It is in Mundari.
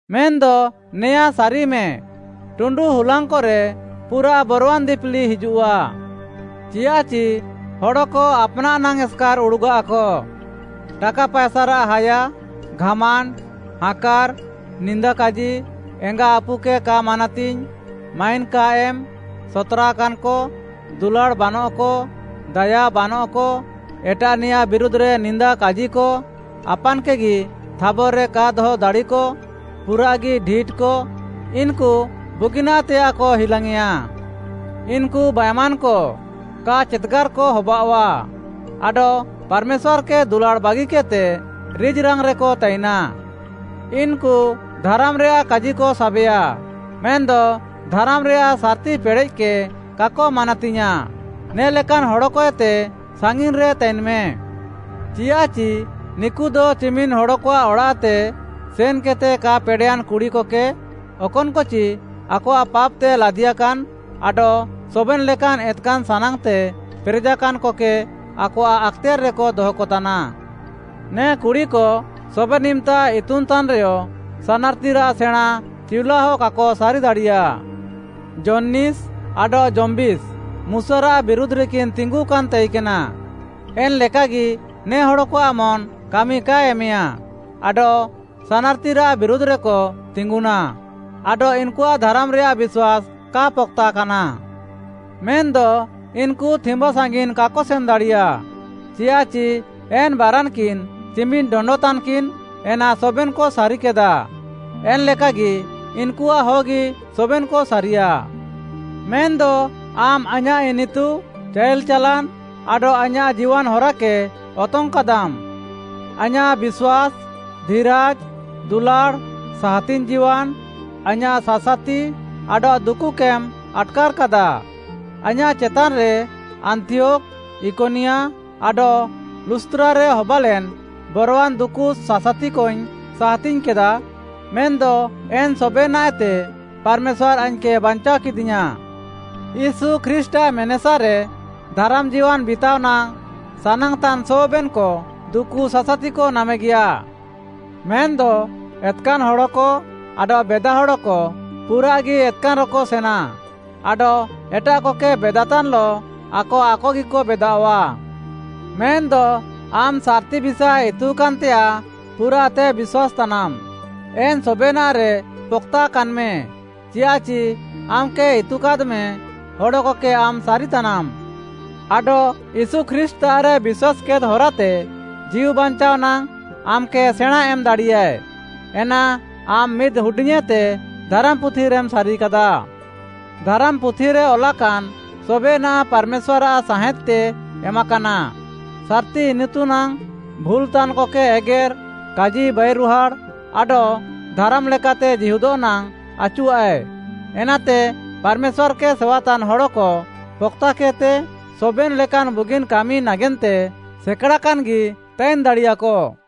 ମେନ୍‌ଦ ନେୟାଁ ସାରିମେ, ଟୁଣ୍ଡୁ ହୁଲାଙ୍ଗ୍‌କରେ ପୁରାଃ ବରୱାନ୍‌ ଦିପିଲି ହିଜୁଃଆ। ଚିୟାଃଚି ହଡ଼କ ଆପ୍‌ନାଃ ନାଙ୍ଗ୍‌ ଏସ୍‌କାର୍‌ ଉଡ଼ୁଗାଃକ, ଟାକା ପାଏସାରାଃ ହାୟା, ଘାମାଣ୍ଡ୍‌, ହାଁକାର୍‌, ନିନ୍ଦା କାଜି, ଏଙ୍ଗା ଆପୁକେ କା ମାନାତିଙ୍ଗ୍‌, ମାଇନ୍‌ କା ଏମ୍‌, ସତ୍‌ରାକାନ୍‌କ, ଦୁଲାଡ଼୍‌ ବାନଃକ, ଦାୟା ବାନଃକ, ଏଟାଃନିୟାଃ ବିରୁଧ୍‌ରେ ନିନ୍ଦା କାଜିକ, ଆପାନ୍‌କେଗି ଥାବର୍‌ରେ କା ଦହ ଦାଡ଼ିକ, ପୁରାଃଗି ଢିଟ୍‌କ, ଇନ୍‌କୁ ବୁଗିନାଃତେୟାଃକ ହିଲାଙ୍ଗ୍‌ୟେଁଆ। ଇନ୍‌କୁ ବାଏମାନ୍‌କ, କା ଚେତ୍‌ଗାର୍‌କ ହବାଅଃଆ ଆଡଃ ପାର୍‌ମେଶ୍ୱାର୍‌କେ ଦୁଲାଡ଼୍‌ ବାଗିକେଦ୍‍ତେ ରିଜ୍‌ରାଙ୍ଗ୍‌ରେକ ତାଇନା। ଇନ୍‌କୁ ଧାରାମ୍‌ରେୟାଃ କାଜିକ ସାବେୟା, ମେନ୍‌ଦ ଧାରାମ୍‌ରେୟାଃ ସାର୍‌ତି ପେଡ଼େଃକେ କାକ ମାନାତିୟାଁଃ, ନେ ଲେକାନ୍‌ ହଡ଼କଏତେ ସାଙ୍ଗିନ୍‌ରେ ତାଇନ୍‌ମେ। ଚିୟାଃଚି ନିକୁଦ ଚିମିନ୍‌ ହଡ଼କଆଃ ଅଡ଼ାଃତେ ସେନ୍‌କେଦ୍‌ତେ କା ପେଡ଼େୟାନ୍‌ କୁଡ଼ିକକେ, ଅକନ୍‌କଚି ଆକଆଃ ପାପ୍‌ତେ ଲାଦିୟାକାନ୍‌ ଆଡଃ ସବେନ୍‌ ଲେକାନ୍‌ ଏତ୍‌କାନ୍‌ ସାନାଙ୍ଗ୍‌ତେ ପେରେଜାକାନ୍‌କକେ ଆକଆଃ ଆକ୍‌ତେୟାର୍‌ରେକ ଦହକତାନା। ନେ କୁଡ଼ିକ ସବେନ୍‌ ଇମ୍‌ତା ଇତୁନ୍‍ତାନ୍‌ରେୟ ସାନାର୍‌ତିରାଃ ସେଣାଁଁ ଚିଉଲାହ କାକ ସାରି ଦାଡ଼ିୟାଃ। ଯନ୍ନୀସ୍‌ ଆଡଃ ଯମ୍ବୀସ୍ ମୁଶାରାଃ ବିରୁଧ୍‌ରେକିନ୍‌ ତିଙ୍ଗୁକାନ୍‌ ତାଇକେନା, ଏନ୍‌ଲେକାଗି ନେ ହଡ଼କଆଃ ମନ୍‌ କାମି କାଏ ଏମେୟା, ଆଡଃ ସାନାର୍‌ତିରାଃ ବିରୁଧ୍‌ରେକ ତିଙ୍ଗୁନାଃ ଆଡଃ ଇନ୍‌କୁଆଃ ଧାରାମ୍‌ରେୟାଃ ବିଶ୍ୱାସ୍‌ କା ପକ୍‌ତାକାନା। ମେନ୍‌ଦ ଇନ୍‌କୁ ଥିମ୍ବା ସାଙ୍ଗିନ୍‌ କାକ ସେନ୍‌ ଦାଡ଼ିୟା, ଚିୟାଃଚି ଏନ୍‌ ବାରାନ୍‌କିନ୍‌ ଚିମିନ୍‌ ଡଣ୍ଡ ତାନ୍‌କିନ୍‌, ଏନା ସବେନ୍‌କ ସାରିକେଦା, ଏନ୍‌ ଲେକାଗି ଇନ୍‌କୁଆଃହଗି ସବେନ୍‌କ ସାରିୟା। ମେନ୍‌ଦ ଆମ୍‌ ଆଇଁୟାଃ ଇନିତୁ, ଚାଇଲ୍‌ ଚାଲାନ୍‌, ଆଡଃ ଆଇଁୟାଃ ଜୀୱାନ୍‌ ହରାକେ ଅତଙ୍ଗ୍‌କାଦାମ୍‌। ଆଇଁୟାଃ ବିଶ୍ୱାସ୍‌, ଧିରାଜ୍‌, ଦୁଲାଡ଼୍‌, ସାହାତିଙ୍ଗ୍‌ ଜୀୱାନ୍‌, ଆଇଁୟାଃ ସାସାତି, ଆଡଃ ଦୁକୁକେମ୍‌ ଆଟ୍‌କାର୍‌କାଦା। ଆଇଁୟାଃ ଚେତାନ୍‌ରେ ଆନ୍ତିୟୋଖ୍‌, ଇକନିୟା ଆଡଃ ଲୁସ୍‌ତ୍ରାରେ ହବାଲେନ୍‌ ବରୱାନ୍‌ ଦୁକୁ ସାସାତିକଇଙ୍ଗ୍‌ ସାହାତିଙ୍ଗ୍‌କେଦା। ମେନ୍‌ଦ ଏନ୍‌ ସବେନାଃଏତେ ପାର୍‌ମେଶ୍ୱାର୍‌ ଆଇଙ୍ଗ୍‌କେ ବାଞ୍ଚାଅକେଦିୟାଁଃ। ୟୀଶୁ ଖ୍ରୀଷ୍ଟ୍‌ଆଃ ମେନେସାରେ ଧାରାମ୍‌ ଜୀୱାନ୍‌ ବିତାଅ ନାଙ୍ଗ୍‌ ସାନାଙ୍ଗ୍‌ତାନ୍‌ ସବେନ୍‌କ ଦୁକୁ ସାସାତିକ ନାମେଗିୟା। ମେନ୍‌ଦ ଏତ୍‌କାନ୍‌ ହଡ଼କ ଆଡଃ ବେଦା ହଡ଼କ ପୁରାଃଗି ଏତ୍‌କାନ୍‌ରେକ ସେନା ଆଡଃ ଏଟାଃକକେ ବେଦାତାନ୍‌ଲଃ ଆକ ଆକଗିକ ବେଦାଅଃଆ। ମେନ୍‌ଦ ଆମ୍‌ ସାର୍‌ତି ବିଷାଏ ଇତୁକାନ୍‌ତେୟାଃ ପୁରାଃତେ ବିଶ୍ୱାସ୍‌ତାନାମ୍‌, ଏନ୍‌ ସବେନାଃରେ ପକ୍‌ତାକାନ୍‌ମେ। ଚିୟାଃଚି ଆମ୍‌କେ ଇତୁକାଦ୍‌ମେ ହଡ଼କକେ ଆମ୍‌ ସାରିତାନାମ୍‌। ଆଡଃ ୟୀଶୁ ଖ୍ରୀଷ୍ଟ୍‌ତାଃରେ ବିଶ୍ୱାସ୍‌କେଦ୍‌ ହରାତେ ଜୀଉ ବାଞ୍ଚାଅ ନାଙ୍ଗ୍‌ ଆମ୍‌କେ ସେଣାଁଁ ଏମ୍‌ ଦାଡ଼ିୟାଏ, ଏନା ଆମ୍‌ ମିଦ୍‌ ହୁଡିଙ୍ଗ୍‌ଏତେ ଧାରାମ୍‌ପୁଥିରେମ୍‌ ସାରିକାଦା। ଧାରାମ୍‌ପୁଥିରେ ଅଲାକାନ୍‌ ସବେନାଃ ପାର୍‌ମେଶ୍ୱାର୍‌ଆଃ ସାହେଁଦ୍‌ତେ ଏମାକାନା, ସାର୍‌ତି ଇନିତୁ ନାଙ୍ଗ୍‌, ଭୁଲ୍‌ତାନ୍‌କକେ ଏଗେର୍‌, କାଜି ବାଇରୁହାଡ଼୍‌, ଆଡଃ ଧାରାମ୍‌ ଲେକାତେ ଜୀହୁଦଃ ନାଙ୍ଗ୍‌ ଆଚୁଆଃଏ, ଏନାତେ ପାର୍‌ମେଶ୍ୱାର୍‌କେ ସେୱାତାନ୍‌ ହଡ଼କ ପକ୍‌ତାକେଦ୍‌ତେ, ସବେନ୍‌ ଲେକାନ୍‌ ବୁଗିନ୍‌ କାମି ନାଗେନ୍ତେ ସେକାଡ଼ାକାନ୍‌ଗି ତାଇନ୍‌ ଦାଡ଼ିୟାକ।